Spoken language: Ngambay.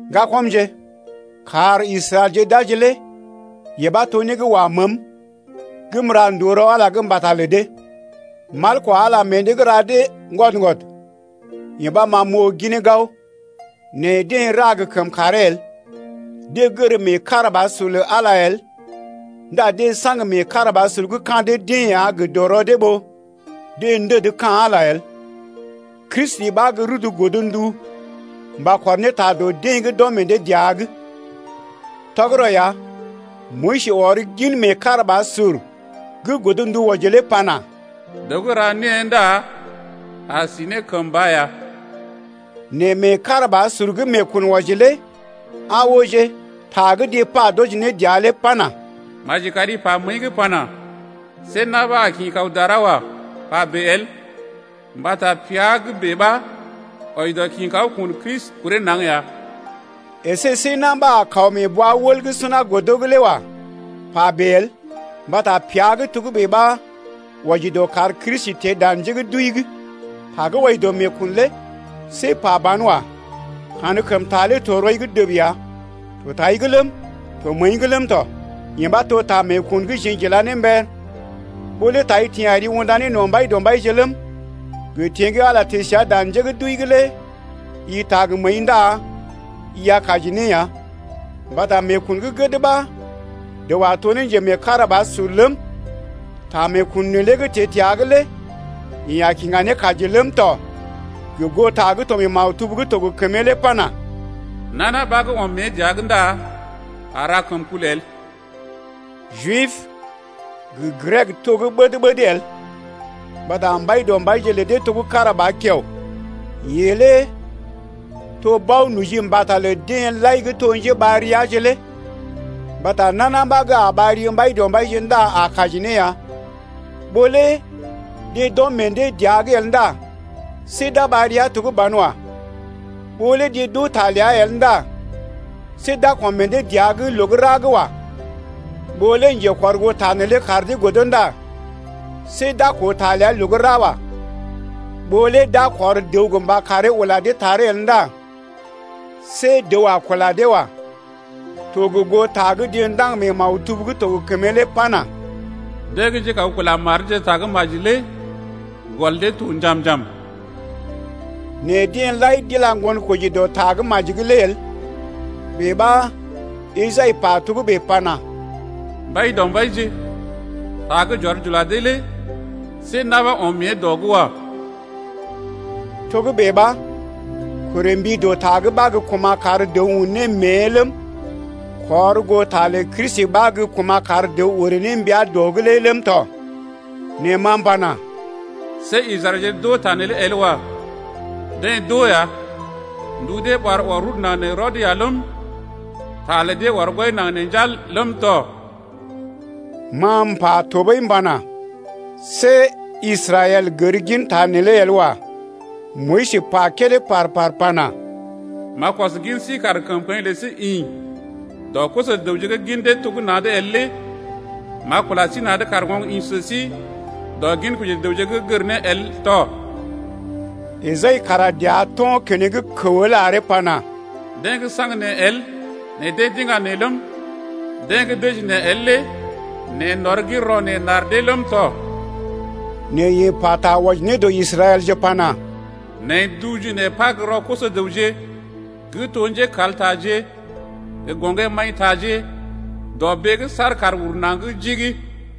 Ŋgakɔmje, kar Israɛlje d’aji lé yee ɓa to né gə́ wa məəm gə́ m’ra ndòo rɔ Ala’g mbata lə dee. Mal kwa Ala meḛ dee’g ra dee ŋgwɔd-ŋgwɔd, yee ɓa ma m’oo ginee gao, nɛ deḛ ra gə kəmkàree el. Deḛ gər meekarabasur lə Ala el ndá deḛ saŋg meekarabasur gə́ ka̰ dee-deḛ ya gə dɔrɔ dee ɓó deḛ ndəd ka̰ Ala lé el. Kristi ɓa gə́ rudu godndu mba kɔr ne ta dɔ deḛ gə́ d’ɔm meḛ dee dəa’g ya. Tɔgərɔ ya Moyis ɔr gin meekarabasur gə́ godndu wɔji lé pana: Dəw gə́ ra née ndá a si ne kəmba ya. Nɛ meekarabasur gə́ meekun wɔji lé aa ooje ta gə́ deḛ pa d’wɔji ne dəa lé pana: Maji kari pa məəi’g pana: See na̰ ɓa a kḭ kaw dara wa, pa bèe el. Mbata pea gə́ bèe ɓa wɔji dɔ kḭ kaw kun Kristi kuree naŋg ya. Esé see na̰ ɓa a kaw mee bwa-wəl gə́ suna godo’g lé wa, pa bèe el mbata pea gə́ togə́bè ɓa wɔji dɔ kar Kristi teḛ dan njé gə́ d’wəi’g. Ta gə́ wɔji dɔ meekun lé see pa ban wa. Kankəmta lé to rɔi’g dəb ya. To tai’g ləm, to məəi’g ləm tɔ. Yee ɓa to ta meekun gə́ jeḛ j’ila ne mber lé. Ɓó lé tai teḛ ari unda ne no̰ Mbaidɔmbaije ləm, gə teḛ gə́ Ala teḛ səa dan njé gə́ d’wəi’g lé i taa gə məəi ndá i a kaji ne ya. Mbata meekun gə́ gəd ɓa dəw a to ne njemeekarabasur ləm, ta meekun neelé gə́ teḛ təa’g lé yeḛ a kiŋga ne kaji ləm tɔ gə goo ta gə́ to maktub gə́ to gə kəmee lé pana: Nana ɓa gə́ ɔm mée dəa’g ndá a ra kəmkul el. Jib gə Grek to gə́ ɓəd-ɓəd el mbata Mbaidɔmbaije lə dee to gə́ kára ba kiao. Yeḛ lé to bao-noji mbata lə deḛ lai gə́ to njeɓar riaje lé. Mbata nana ɓa gə́ a ɓar ri Mbaidɔmbaije ndá a kaji ne ya. Ɓó lé deḛ d’ɔm meḛ dee dəa’g el ndá see d’a ɓar ria to gə́ banwa. Ɓó lé deḛ d’oo ta ləa el ndá see d’a kɔm meḛ dee dəa’g loo gə́ ra wa. Ɓó lé njekɔrgoota neelé kar dee godo ndá see d’a koo ta ləa loo gə́ ra wa. Ɓó lé d’a kɔr dəw gə mba karee ula dee taree el ndá see dəw a kula dee wa. To gə goo ta gə́ deḛ ndaŋg mee maktub gə́ to gə kəmee lé pana: Deḛ gə́ njékaw kula mar deeje ta gə́ maji lé gɔl dee to njam-njam. Nɛ deḛ lai d’ila ŋgonkoji dɔ ta gə́ maji’g lé el. Bèe ɓa Esai pa ne togə́bè pana: Mbaidɔmbaije, ta gə́ j’ɔr j’ula dee lé see na̰ ɓa ɔm mée dɔ’g wa. Togə́bè ɓa korè mbi dɔ ta’g ɓa gə́ kuma̰ kar dəw un ne mée ləm, kɔr goo ta lə Kristi ɓa gə́ kuma̰ kar dəw orè ne mbia dɔ’g lé ləm tɔ. Nɛ ma m’pana: See Israɛlje d’oo ta neelé el wa. Deḛ d’oo ya. Ndu dee ɓar ɔr rudu naŋg nee rɔd ya ləm, Ta lə dee ɔr gwɔi naŋg nee njal ləm tɔ. Ma m’pa tɔɓəi pana: See Israɛl gər ginta neelé el wa. Moyis pa kédé par-par pana: M’a kɔs gin sí kar kəmkəḭ lə sí ḭ Dɔ koso-dəwje’g gə́ gin dee to gə́ na̰’d el lé, M’a kula sí na̰’d kar oŋg ḭ sə sí Dɔ ginkoji dəwje gə́ gər né el tɔ. Esai kara dəa to̰ keneŋ kəw el aree pana: Deḛ gə́ saŋg neḛ el nɛ deḛ d’iŋga neḛ ləm, Deḛ gə́ dəji neḛ el lé neḛ n’ɔr gin rɔ neḛ n’ar dee ləm tɔ. Nɛ yeḛ pata wɔji ne dɔ Israɛlje pana: Neḛ n’duu ji neḛ par gə́ rɔ koso-dəwje Gə́ to njékaltaje gə gɔŋgé-maḭtaje Dɔbee’g saar kàr ur naŋg jigi.